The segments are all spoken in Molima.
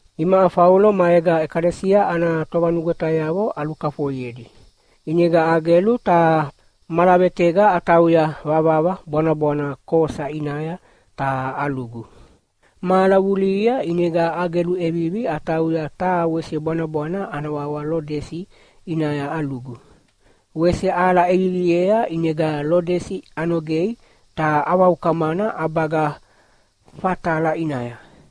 Imaʼa Faulo maega ʼekalesia ana tovanugwetayavo alukafoiedi, ʼinega agelu ta malavetega atauya vavava bwanabwana Kosa ʼinaya ta alugu. Mahala vulihia ʼinega agelu ʼevivi atauya taha wese bwanabwana ana wawa Lodesi ʼinaya alugu. Wese ahala ʼeviviea ʼinega Lodesi anogei ta avaukamana ʼabaga Fatala ʼinaya.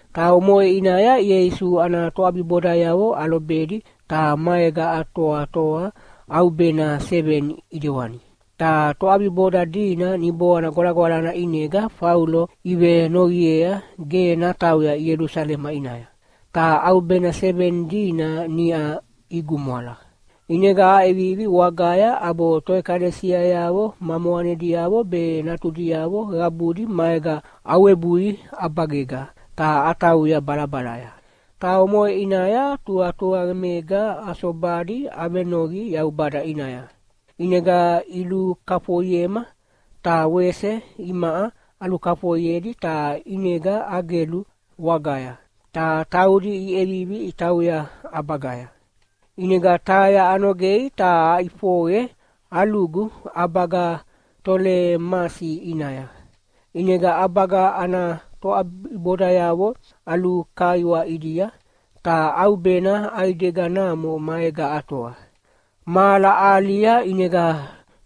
Ta omoʼe ʼinaya Ieisu ana toʼabibodayavo alobedi ta maega atoatoa ʼaubena seveni ʼidewani. Ta toʼabiboda dina Niboana Gwalagwalana ʼinega Faulo ivenoqiea ge natauya Ielusalema ʼinaya. Ta ʼaubena seveni dina niʼa igumwala. ʼInega aʼevivi wagaya ʼabo toʼekalesiayavo ma moqanediavo be natudiavo qabudi maega awebui ʼabagega ta atauya balabalaya. Ta omoʼe ʼinaya tuqatuqamega asobadi avenoqi Yaubada ʼinaya. ʼInega ilukafoiema ta wese imaʼa alukafoiedi ta ʼinega agelu wagaya, ta taudi iʼevivi itauya ʼabagaya. ʼInega Taia anogei ta aʼifoqe alugu ʼabaga Tolemasi ʼinaya. ʼInega ʼabaga ana toʼabibodayavo alukaiwa ʼidia, ta ʼaubena ʼaideganamo maega atoa. Mahala ahalia ʼinega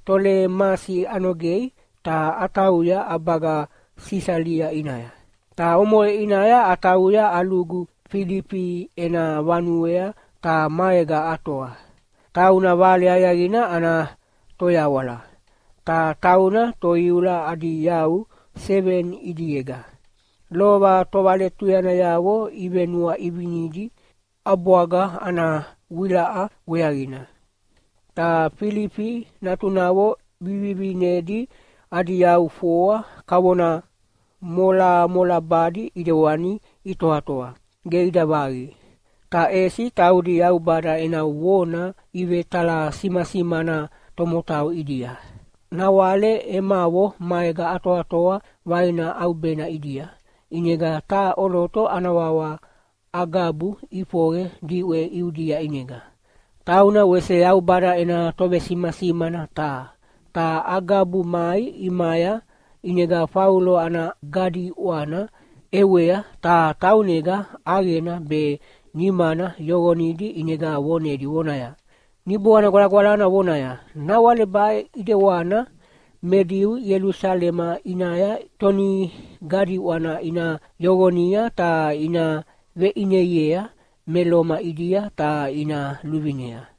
Tolemasi anogei ta atauya ʼabaga Sisalia ʼinaya. Ta omoʼe ʼinaya atauya alugu Filifi ena vanuea ta maega atoa. Tauna Vale Aqiaqina ana toyawala, ta tauna toiula adi yau seveni ʼidiega, lova tovaletuyanayavo ivenuaʼivinidi ʼabwaga ana vewilaʼa weaqina. Ta Filifi natunavo vivivinedi adi yau foa kavona molamolabadi ʼidewani itoatoa, ge ida vaqi. Ta ʼesi taudi Yaubada ena vona ivetalasimasimana tomotau ʼidia. Nawale emavo maega atoatoa vaina ʼaubena ʼidia, ʼinega taha ʼoloto ana wawa Agabu ʼifoqe diʼwe Iudia ʼinega. Tauna wese Yaubada ena tovesimasimana taha. Ta Agabu mai ʼimaya ʼinega Faulo ana gadiʼwana ʼewea ta taunega ʼaqena be nimana yoqonidi ʼinega vonedi vonaya, “Niboana Gwalagwalana vonaya, ‘Nawale baʼe ʼidewana me Diu Ielusalema ʼinaya tonigadiʼwana ina yoqonia ta ina veʼineiea me Loma ʼidia ta ina luvinea.’”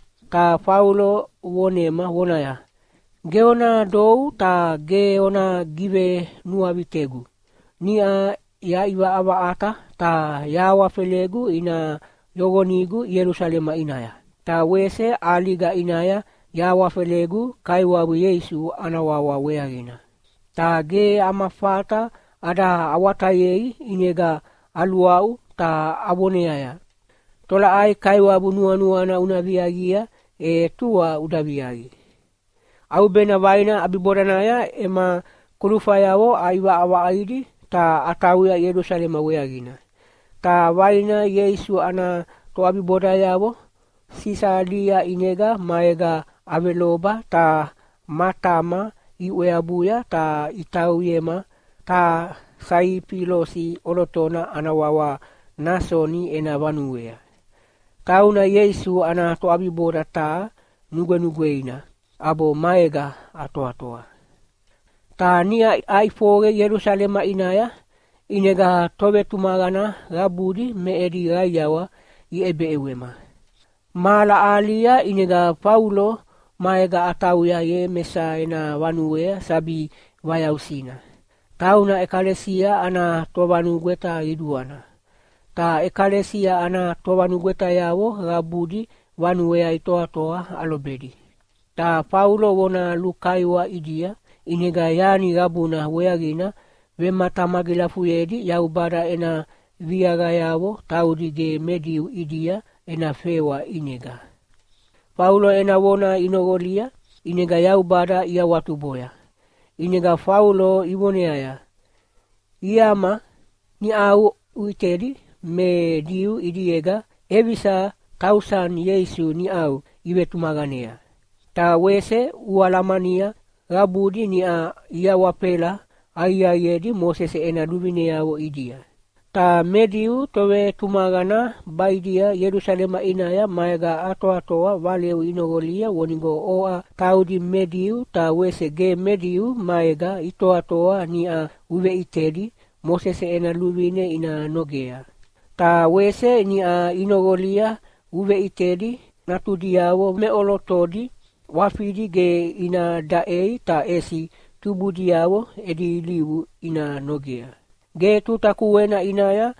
Ta Faulo vonema vonaya, “Ge ona dou ta ge ona givenuavitegu. Niʼa yaʼivaʼavaʼata ta yahawafelegu ina yoqonigu Ielusalema ʼinaya, ta wese ʼaliga ʼinaya yahawafelegu Kaiwabu Ieisu ana wawa weaqina.” Ta ge ama fata ada awatayei ʼinega aluaʼu ta avoneaya, “Tolaʼai Kaiwabu nuanuana una viaqia, e tua uda viaqi!” ʼAubena vaina ʼabibodanaya ema kulufayavo aʼivaʼavaʼaidi ta atauya Ielusalema weaqina. Ta vaina Ieisu ana toʼabibodayavo Sisalia ʼinega maega aveloba ta matama iʼweabuya ta itauyema taha Saifilosi ʼolotona ana wawa Nasoni ena vanuea. Tauna Ieisu ana toʼabiboda taha nugwenugweina, ʼabo maega atoatoa. Ta niʼa aʼifoqe Ielusalema ʼinaya, ʼinega tovetumaqana qabudi me edi qaiawa iʼebeʼewema. Mahala ahalia ʼinega Faulo maega atauya Iemesa ena vanuea sabi vayausina, tauna ʼekalesia ana tovanugweta qiduana. Ta ʼekalesia ana tovanugwetayavo qabudi vanuea itoatoa alobedi. Ta Faulo vona lukaiwa ʼidia, ʼinega yani qabuna weaqina vematamagilafuyedi Yaubada ena viaqayavo taudi ge me Diu ʼidia ena fewa ʼinega. Faulo ena vona inoqolia, ʼinega Yaubada iawatuboya. ʼInega Faulo ivoneaya, “Iama, niʼau uʼitedi me Diu ʼidiega ʼevisa tausani Ieisu niʼau ivetumaqanea! Ta wese ualamania qabudi niʼa iawafela aqiaqiedi Mosese ena luvineavo ʼidia. Ta me Diu tovetumaqana baʼidia Ielusalema ʼinaya maega atoatoa valeu inoqolia vonigo oʼa taudi me Diu ta wese ge me Diu maega itoatoa niʼa uveʼitedi Mosese ena luvine ina nogea. Ta wese niʼa inoqolia uveʼitedi natudiavo meʼolotodi ʼwafidi ge ina daʼei ta ʼesi tubudiavo edi ilivu ina nogea. Ge tuta kuena ʼinaya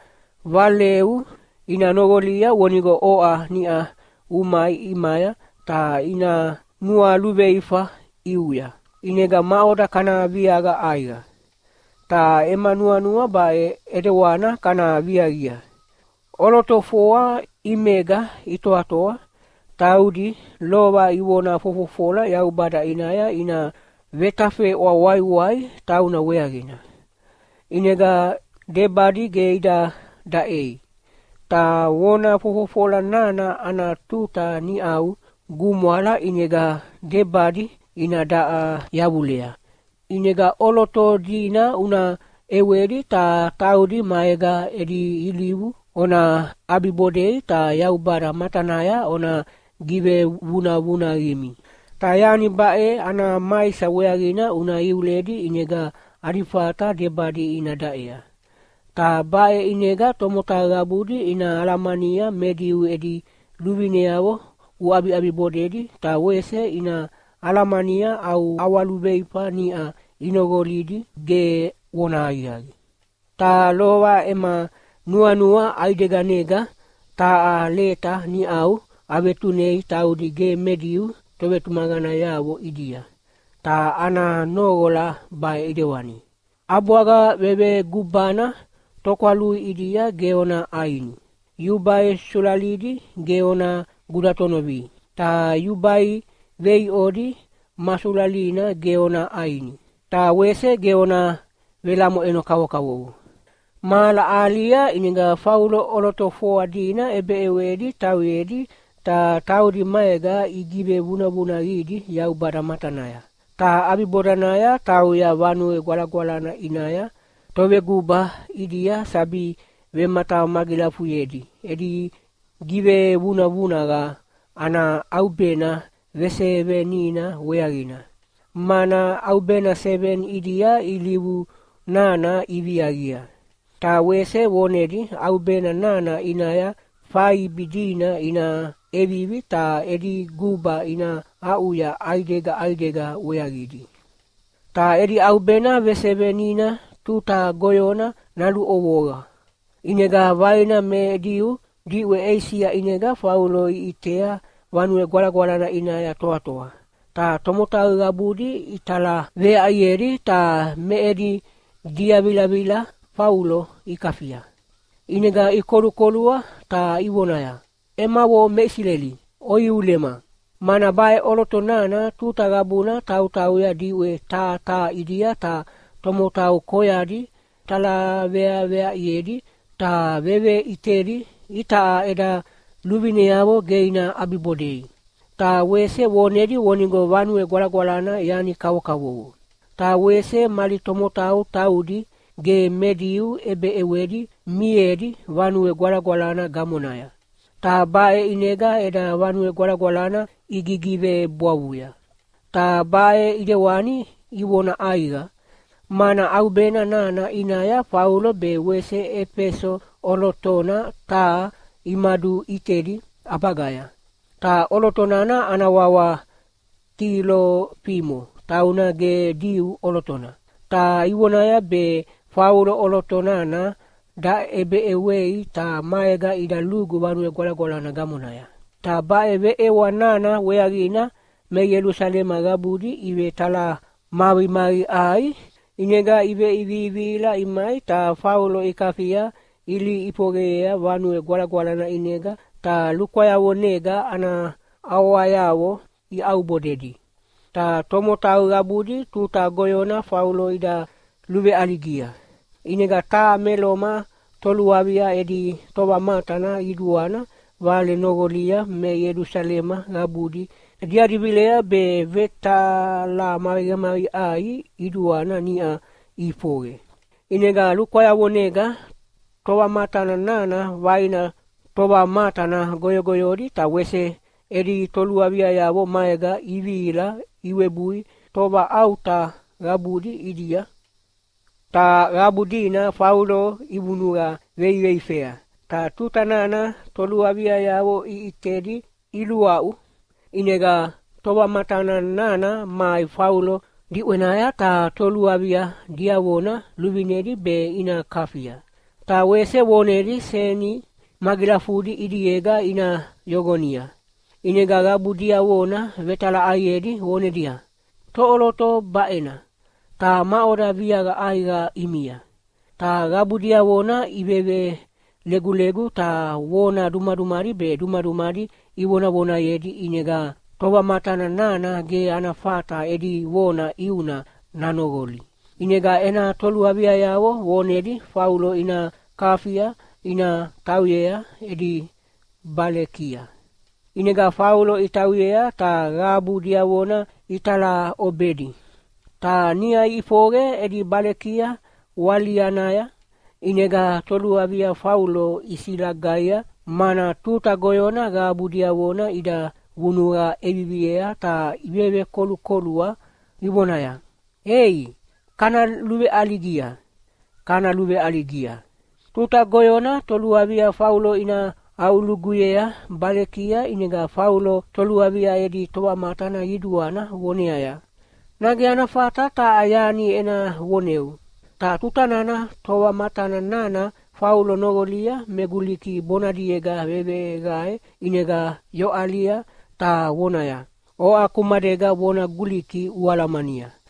valeu ina noqolia vonigo oʼa niʼa umai ʼimaya ta ina nualuveifa ʼiuya. ʼInega maʼoda kana viaqa ʼaiqa? Ta ema nuanua baʼe ʼedewana kana viaqia: ʼOloto foa ʼimega itoatoa, taudi lova ivona fofofola Yaubada ʼinaya ina vetafeʼwa waiwai tauna weaqina. ʼInega debadi ge ida daʼei. Ta vona fofofola nana ana tuta niʼau gumwala ʼinega debadi ina daʼa yavulea. ʼInega ʼoloto dina una ʼewedi ta taudi maega edi ilivu ona ʼabibodei ta Yaubada matanaya ona givevunavunaqimi. Ta yani baʼe ana maisa weaqina una iuledi ʼinega adi fata debadi ina daʼea. Ta baʼe ʼinega tomotau qabudi ina alamania me Diu edi luvineavo uʼabiʼabibodedi ta wese ina alamania au ʼawaluveifa niʼa inoqolidi ge vonahaqiaqi. Ta lova ema nuanua ʼaideganega taha leta niʼau avetunei taudi ge me Diu tovetumaqanayavo ʼidia, ta ana noqola baʼe ʼidewani: ‘ʼAbwaga vevegubana tokwalui ʼidia ge ona ʼaini. Yubai sulalidi ge ona gudatonovi. Ta yubai veiʼodi ma sulalina ge ona ʼaini. Ta wese ge ona velamoʼeno kavokavovo.’” Mahala ahalia ʼinega Faulo ʼoloto foa dina ʼebeʼewedi tauyedi ta taudi maega igivevunavunaqidi Yaubada matanaya. Ta ʼabibodanaya tauya Vanue Gwalagwalana ʼinaya toveguba ʼidia sabi vematamagilafuyedi edi givevunavunaqa ana ʼaubena vesevenina weaqina, mana ʼaubena seveni ʼidia ilivu nana iviaqia. Ta wese vonedi ʼaubena nana ʼinaya faibi dina ina ʼevivi ta edi guba ina aʼuya ʼaidega ʼaidega weaqidi. Ta edi ʼaubena vesevenina tuta goyona naluʼovoa. ʼInega vaina me Diu diʼwe Eisia ʼinega Faulo iʼitea Vanue Gwalagwalana ʼinaya toatoa. Ta tomotau qabudi italaveaʼiedi ta me edi diavilavila Faulo ikafia. ʼInega ikolukolua ta ivonaya, “Emavo me Isileli, oiulema! Mana baʼe ʼoloto nana tuta qabuna tautauya diʼwe taha taha ʼidia ta tomotau koyadi talaveaveaʼiedi ta veveʼitedi itaʼa eda luvineavo ge ina ʼabibodei, ta wese vonedi vonigo Vanue Gwalagwalana yani kavokavovo. Ta wese mali tomotau taudi ge me Diu ʼebeʼewedi mimiedi Vanue Gwalagwalana gamonaya, ta baʼe ʼinega eda Vanue Gwalagwalana igigivebwavuya.” Ta baʼe ʼidewani ivona ʼaiqa, mana ʼaubena nana ʼinaya Faulo be wese Efeso ʼolotona taha imaduʼitedi ʼabagaya, ta ʼoloto nana ana wawa Tilofimo tauna ge Diu ʼolotona. Ta ivonaya be Faulo ʼoloto nana daʼebeʼewei ta maega ida lugu Vanue Gwalagwalana gamonaya. Ta baʼe veʼewa nana weaqina me Ielusalema qabudi ivetalamaqimaqiʼai. ʼInega iveʼivivihila imai ta Faulo ikafia ilihi ʼifoqeyea Vanue Gwalagwalana ʼinega ta lukwayavonega ana ʼawayavo iaʼubodedi. Ta tomotau qabudi tuta goyona Faulo ida luveʼaligia. ʼInega taha me Loma toluavia edi tovamatana qiduana vale noqolia me Ielusalema qabudi diadi vilea be vetalamaqimaqiʼai qiduana niʼa ʼifoqe. ʼInega lukwayavonega tovamatana nana vaina tovamatana goyogoyodi ta wese edi toluaviayavo maega ivihila iwebui tovaʼauta qabudi ʼidia. Ta qabu dina Faulo ivunuqa veiveifea, ta tuta nana toluaviayavo iʼitedi iluaʼu. ʼInega tovamatana nana mai Faulo diʼwenaya ta toluavia diavona luvinedi be ina kafia. Ta wese vonedi seni magilafudi ʼidiega ina yoqonia. ʼInega qabu diavona vetalaʼaiedi vonedia, “Toʼoloto baʼena, ta maʼoda viaqa ʼaiqa ʼimia?” Ta qabu diavona ivevelegulegu ta vona dumadumadi be dumadumadi ivonavonayedi ʼinega tovamatana nana ge ana fata edi vona ʼiuna danoqoli. ʼInega ena toluaviayavo vonedi Faulo ina kafia ina tauyea edi balekia. ʼInega Faulo itauyea ta qabu diavona italaʼobedi. Ta niʼa iʼifoqe edi balekia walianaya, ʼinega toluavia Faulo isilagaia, mana tuta goyona qabu diavona ida vunuqa ʼeviviea ta ivevekolukolua ivonaya, “Ei, kana luveʼaligia, kana luveʼaligia!” Tuta goyona toluavia Faulo ina aʼuluguyea balekia ʼinega Faulo toluavia edi tovamatana qiduana voneaya, “Nage ana fata taha yani ena voneu?” Ta tuta nana tovamatana nana Faulo noqolia me Guliki bonadiega veveqae ʼinega yoʼalia ta vonaya, “Oʼa kumadega vona Guliki ualamania!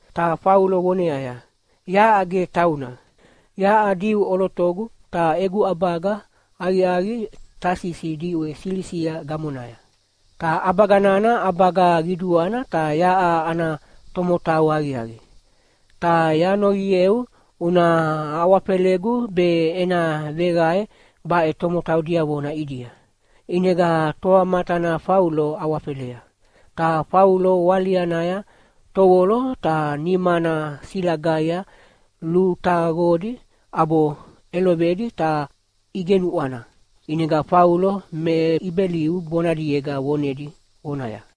Ta Faulo voneaya, “Yaʼa ge tauna! Yaʼa Diu ʼolotogu ta egu ʼabaga aqiaqi Tasisi diʼwe Silisia gamonaya, ta ʼabaga nana ʼabaga qiduana ta yaʼa ana tomotau aqiaqi. Ta yanoqieu una awafelegu be ena veqae baʼe tomotau diavona ʼidia?” ʼInega tovamatana Faulo awafelea. Ta Faulo walianaya tovolo ta nimana silagaia lutaqodi ʼabo ʼelovedi ta igenuʼwana. ʼInega Faulo me Ibeliu bonadiega vonedi vonaya,